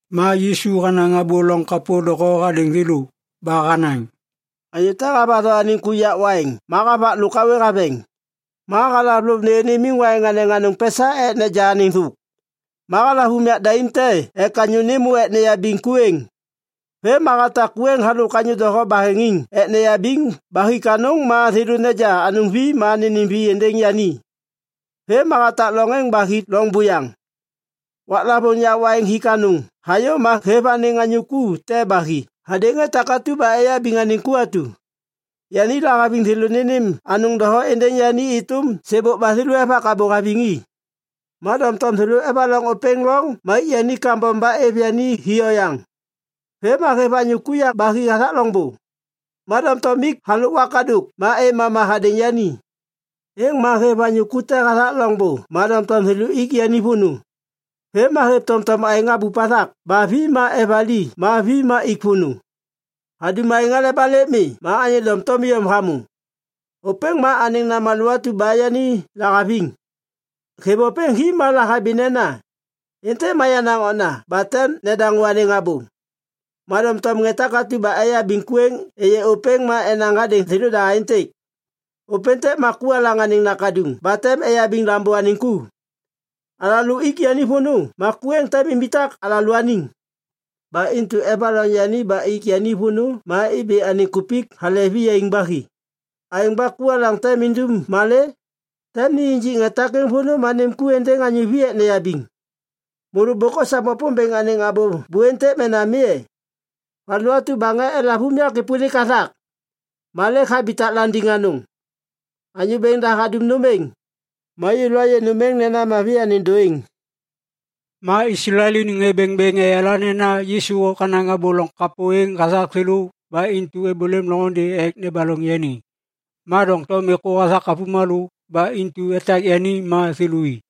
Ma Yisu hanaŋ abô loŋ kapô doho hadêŋ thêlô. Ba hanaŋ, “Anyô te havatho anêŋ ku yak waiŋ ma havak lôk hawê haveŋ. Ma halav lôv nêyô nimiŋ waiŋ anêŋ anôŋ pesa ek neja anêŋ thôk. Ma halav unyak daim te ek anyô nêmô ek neyabiŋ ku êŋ. Vêm ma hatak ku êŋ halôk anyô doho baheŋiŋ ek neyabiŋ ba hik anôŋ ma thêlô neja anôŋ vi ma nênêm vi êndêŋ yani. Vêm ma hatak loŋ êŋ ba hi loŋ buyaŋ. Waklavôŋ yak waiŋ hik anôŋ hayô ma hêv anêŋ anyô ku te ba hi hadêŋ ŋê takatu ba eyabiŋ anêŋ ku atu. Yani lahaviŋ thêlô nênêm anôŋ doho êndêŋ yani êtôm sêbôk ba thêlô evak abô haviŋ i. Ma doŋtom thêlô evaloŋ ôpêŋ loŋ ma ik yani kambom ba êv yani hi oyaŋ. Vêm ma hêv anyô ku yaŋ ba hi hathak loŋbô, ma doŋtom ik halôk wakadôk ma êv mama hadêŋ yani. Êŋ ma hêv anyô ku te hathak loŋbô ma doŋtom thêlô ik yani vônô. Vêm ma hêv tomtom aêŋ habup hathak ba vi ma evali ma vi ma ik vônô. “Hadum aêŋ aleba lêk mi ma anyô doŋtom iyom hamô. Ôpêŋ ma anêŋ namalô atu ba yani lahaviŋ. Hêv ôpêŋ hi ma lahabi nena, ‘Êntêk ma yenaŋ okna ba tem nedaŋô anêŋ abô.’ “Ma doŋtom ŋê takatu ba eyabiŋ ku êŋ êyê ôpêŋ ma enaŋ hadêŋ thêlôda aêntêk, ‘Ôpêntêk ma ku alaŋ anêŋ nakaduŋ ba tem eyabiŋ lambô anêŋ ku. Alalô ik yani vônô ma ku êŋ tem imbitak alalôaniŋ.’ Ba intu evaloŋ yani ba ik yani vônô ma ibi anêŋ kupik hale viyaiŋ ba hi. “Aêŋ ba ku alaŋ tem indum malê? Tem ni injik ŋê takêŋ vônô ma nêm ku êŋ êndêŋ anyô vi ek neyabiŋ. Môlô bôk osam Wapômbêŋ anêŋ abô bu êntêk mena mi e? “‘Valu atu ba ŋê elav unyak êpôlik hathak, ma lêk habitak landiŋ anôŋ. Anyô Bêŋ da hadum nôm êŋ, ma yêlô ayê nôm êŋ nena mavi anêŋ dôêŋ.’” Ma Islael iniŋ ŋê bêŋbêŋ eyala nena Yisu hanaŋ abô loŋ kapô êŋ hathak thêlô ba intu êbôlêm loŋôndê ek nebaloŋ yani. Ma doŋtom êkô hathak avômalô, ba intu etak yani ma thêlô i.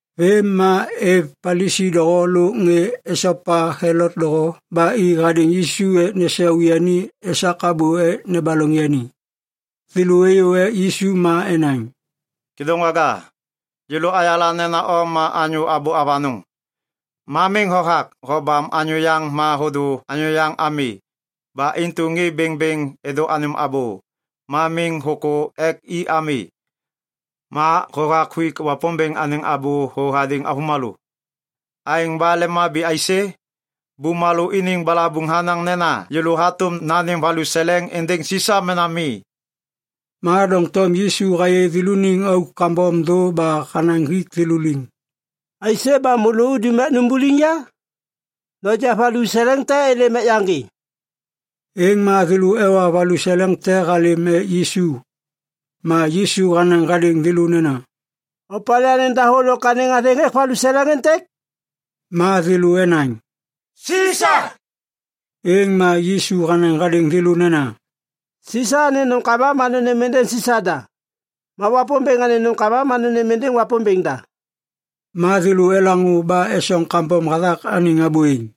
Vêm ma êv Palisi doho lôk ŋê esopa Helot doho ba i hadêŋ Yisu ek nesau yani esak abô ek nebaloŋ yani. Thêlô êyô ek Yisu ma enaŋ, “Kêdôŋwaga, yêlô ayala nena o ma anyô abô avanôŋ. Ma miŋ hothak hobam anyô yaŋ ma hôdô anyô yaŋ ami. Ba intu ŋê bêŋbêŋ êdô anêm abô, ma miŋ hôkô ek i ami. Ma hothak huik Wapômbêŋ anêŋ abô thô hadêŋ avômalô. Aêŋ ba lemhabi aisê? Bumalô iniŋ balabuŋ hanaŋ nena yêlô hatôm nanêm valuseleŋ êndêŋ Sisa mena mi?” Ma doŋtom Yisu hayê thêlôniŋ auk kambom thô ba hanaŋ hik thêlô liŋ, “Aisê ba môlô udum ek numbuliŋ ya? Noja valuseleŋ te êlêm ek yaŋgê.” Êŋ ma thêlô ewa valuseleŋ te halêm ek Yisu. Ma Yisu hanaŋ hadêŋ thêlô nena, “Opalê anêŋ dahô lôk anêŋ athêŋ hêk valuseleŋ êntêk?” Ma thêlô enaŋ, “Sisa.” Êŋ ma Yisu hanaŋ hadêŋ thêlô nena, “Sisa anêŋ nômkama ma nônêm êndêŋ Sisa da. Ma Wapômbêŋ anêŋ nômkama ma nônêm êndêŋ Wapômbêŋ da.” Ma thêlô elaŋô ba esoŋ kambom hathak anêŋ abô êŋ.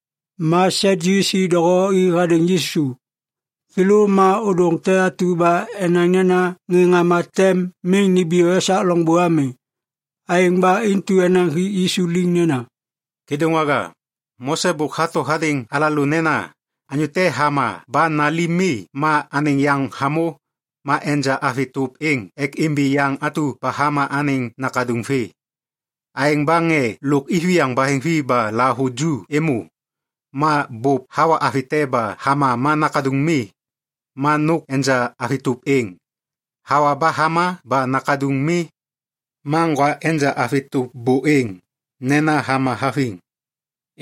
Ma Sadyusi doho i hadêŋ Yisu. Thêlô ma ôdôŋ te atu ba enaŋ nena ŋê ŋama tem miŋ nimbiyô esak loŋbô ami. Aêŋ ba intu enaŋ hik Yisu liŋ nena, “Kêdôŋwaga, Mose bôk hato hadêŋ alalô nena, ‘Anyô te hama ba nali mi ma anêŋ yaŋ hamô, ma enja avi tôp êŋ ek imbi yaŋ atu ba hama anêŋ nakaduŋ vê.’ Aêŋ ba ŋê lôk iviyaŋ baheŋvi ba lahavuju êmô. Ma bôp hawa avi te ba hama ma nakaduŋ mi. Ma nôk enja avi tôp êŋ, hawa ba hama ba nakaduŋ mi. Ma ŋgwa enja avi tôp bô êŋ, nena hama haviŋ.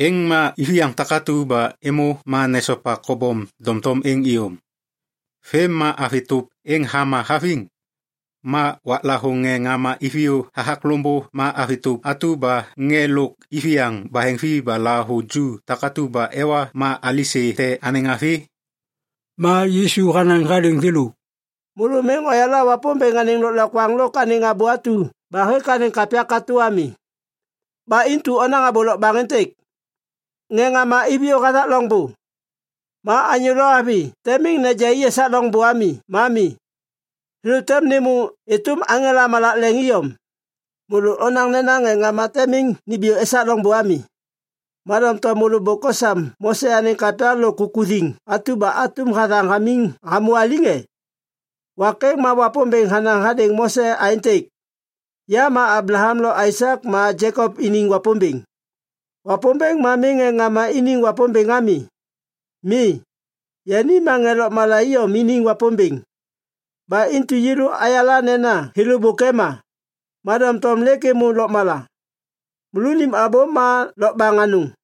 Êŋ ma iviyaŋ takatu ba êmô ma nesopa kobom doŋtom êŋ iyom. Vêm ma avi tôp êŋ hama haviŋ. Ma waklavôŋ ŋê ŋama iviyô hathak loŋbô ma avi tôp atu ba ŋê lôk iviyaŋ baheŋvi ba lahavuju takatu ba ewa ma alisê te anêŋ avi?” Ma Yisu hanaŋ hadêŋ thêlô, “Môlô miŋ oyala Wapômbêŋ anêŋ lôklokwaŋ lôk anêŋ abô atu ba hêk anêŋ kapya katô ami. Ba intu onaŋ abô lokbaŋ êntêk. Ŋê ŋama iviyô hathak loŋbô, ma anyô lo avi tem miŋ neja i esak loŋbô ami ma mi. Thêlô tem nêmô êtôm aŋela malak leŋ iyom. Môlô onaŋ nena ŋê ŋama tem miŋ nimbiyô esak loŋbô ami. Ma doŋtom môlô bôk osam Mose anêŋ kapya lôk kukuthiŋ atum hathaŋ hamô aliŋ e? Wak êŋ ma Wapômbêŋ hanaŋ hadêŋ Mose aêntêk, ‘Ya ma Ablaham lo Aisak ma Jekop iniŋ Wapômbêŋ.’ Wapômbêŋ ma miŋ ŋê ŋama iniŋ Wapômbêŋ ami. Mi, yani ma ŋê lôkmala iyom iniŋ Wapômbêŋ. Ba intu yêlô ayala nena thêlô bôk ema, ma doŋtom lêk êmô lôkmala. Môlônim abô ma lokbaŋ anôŋ!”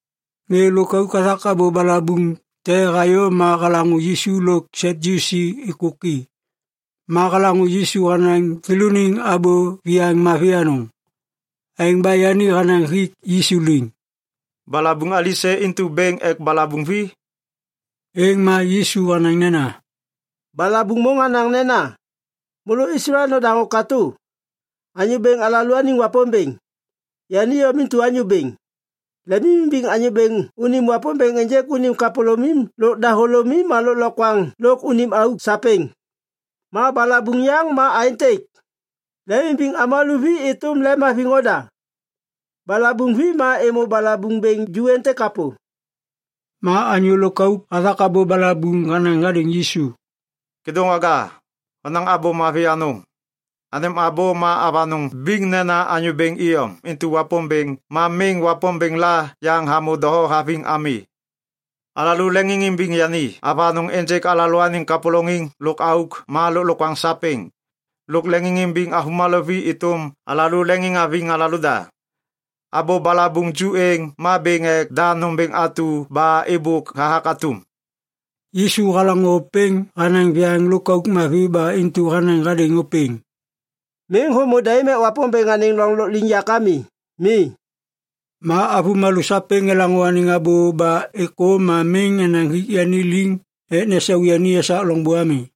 Ŋê lôkauk hathak abô balabuŋ te hayô ma halaŋô Yisu lo Sadyusi êkôki. Ma halaŋô Yisu hanaŋ thêlôniŋ abô viyaiŋ mavi anôŋ. Aêŋ ba yani hanaŋ hik Yisu liŋ, “Balabuŋ alisê intu bêŋ ek balabuŋ vi?” Êŋ ma Yisu hanaŋ nena, “Balabuŋ môŋ hanaŋ nena, ‘Môlô Islael nodaŋô katô. Anyô Bêŋ alalôaniŋ Wapômbêŋ, yani iyom intu Anyô Bêŋ. Lemimimbiŋ Anyô Bêŋ unim Wapômbêŋ ênjêk unim kapôlômim lôk dahôlômim ma lôklokwaŋ lôk unim auk sapêŋ.’ Ma balabuŋ yaŋ ma aêntêk: ‘Lemimbiŋ avômalô vi êtôm lemhaviŋ oda.’ Balabuŋ vi ma êmô balabuŋ bêŋ ju êntêk kapô.” Ma anyô lôkauk hathak abô balabuŋ hanaŋ hadêŋ Yisu, “Kêdôŋwaga, honaŋ abô mavi anôŋ. Anêm abô ma avanôŋ biŋ nena Anyô Bêŋ iyom intu Wapômbêŋ ma miŋ wapômbêŋ la yaŋ hamô doho haviŋ ami. Alalô leŋiŋimbiŋ yani avanôŋ ênjêk alalôaniŋ kapôlôŋiŋ lôk auk ma lôklokwaŋ sapêŋ. Lôk leŋiŋimbiŋ avômalô vi êtôm alalô leŋiŋhaviŋ alalôda. Abô balabuŋ ju êŋ ma bêŋ ek da nômbêŋ atu ba êbôk hathak atum.” Yisu halaŋô ôpêŋ hanaŋ viyaŋ lôkauk mavi ba intu hanaŋ hadêŋ ôpêŋ, “Miŋ hômô daim ek Wapômbêŋ anêŋ loŋ lôkliŋyak ami. Mi.” Ma avômalô sapêŋ elaŋô anêŋ abô ba êkô ma miŋ enaŋ hik yani liŋ ek nesau yani esak loŋbô ami.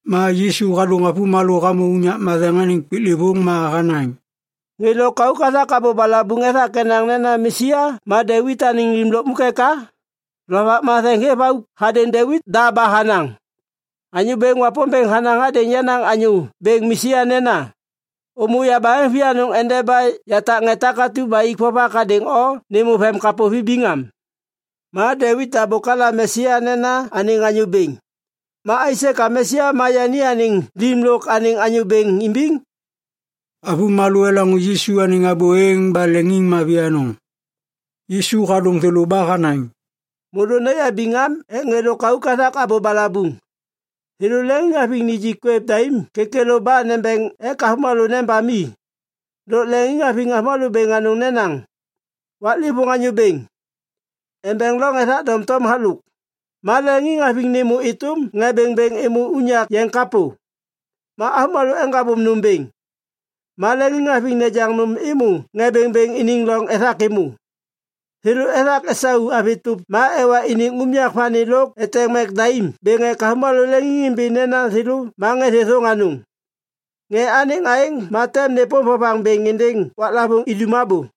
Ma Yisu hadôŋ avômalô hamô unyak matheŋ anêŋ piklêvôŋ ma hanaŋ, “Ŋê lôkauk hathak abô balabuŋ ethak enaŋ nena Mesia ma Devit anêŋ lim lukmuk eka? Lovak Matheŋ hêv auk hadêŋ Devit da ba hanaŋ, “‘Anyô Bêŋ Wapômbêŋ hanaŋ hadêŋ yenaŋ Anyô Bêŋ Mesia nena, “Ômô yabaheŋ vianôŋ endeba yatak ŋê takatu ba ik vovak hadêŋ o nêmô vemkapô vibiŋ am.” ’ Ma Devit da bôk halam Mesia nena anêŋ Anyô Bêŋ. Ma aisê ka Mesia ma yani anêŋ lim lôk anêŋ Anyô Bêŋ imbiŋ?” Avômalô elaŋô Yisu anêŋ abô êŋ ba leŋiŋmavi anôŋ. Yisu hadôŋ thêlô ba hanaŋ, “Môlô noyabiŋ am ek ŋê lôkauk hathak abô balabuŋ. Thêlô leŋiŋhaviŋ nijik kwêv daim kêkêlô ba nembeŋ ek avômalô nebam i. Lôk leŋiŋhaviŋ avômalô bêŋ anôŋ nenaŋ, ‘Waklêvôŋ anyô bêŋ’ embeŋ loŋ ethak doŋtom halôk. Ma leŋiŋhaviŋ nêmô êtôm ŋê bêŋbêŋ êmô unyak yeŋ kapô. Ma avômalô eŋgabôm nôm bêŋ, ma leŋiŋhaviŋ nejaŋ nôm êmô ŋê bêŋbêŋ iniŋ loŋ ethak êmô. Thêlô ethak esau avi tôp ba ewa iniŋ unyak vani lôk eteŋ mek daim bêŋ ek avômalô leŋiŋimbi nena thêlô ma ŋê thêthôŋ anôŋ. Ŋê anêŋ aêŋ ma tem nêpôm vovaŋ bêŋ êndêŋ waklavôŋ idum abô.”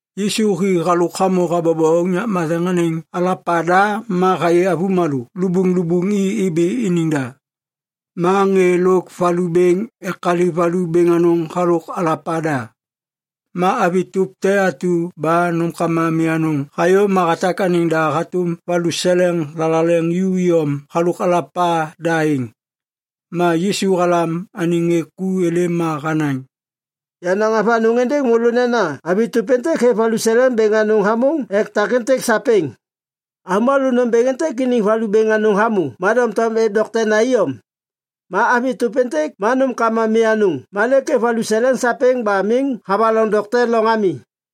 Yisu hi halôk hamô habobo unyak matheŋ anêŋ alapa da ma hayê avômalô lubuŋlubuŋ i ibi iniŋ da. Ma ŋê lôk valu bêŋ ekaliv valu bêŋ anôŋ halôk alapa da. Ma avi tôp te atu ba nômkama mi anôŋ hayô ma hatak anêŋ da hatôm valuseleŋ thalaleŋ ju iyom halôk alapa da êŋ. Ma Yisu halam anêŋ ŋê ku êlêm ma hanaŋ, “Yanaŋ avanôŋ êndêŋ môlô nena avi tôp êntêk hêv valuseleŋ bêŋ anôŋ hamôŋ ek takêntêk sapêŋ. Avômalô nômbêŋ êntêk iniŋ valu bêŋ anôŋ hamô ma doŋtom êv doktena iyom. Ma avi tôp êntêk ma nômkama mi anôŋ ma lêk hêv anêŋ valuseleŋ sapêŋ ba miŋ havaloŋ dokte loŋ ami.”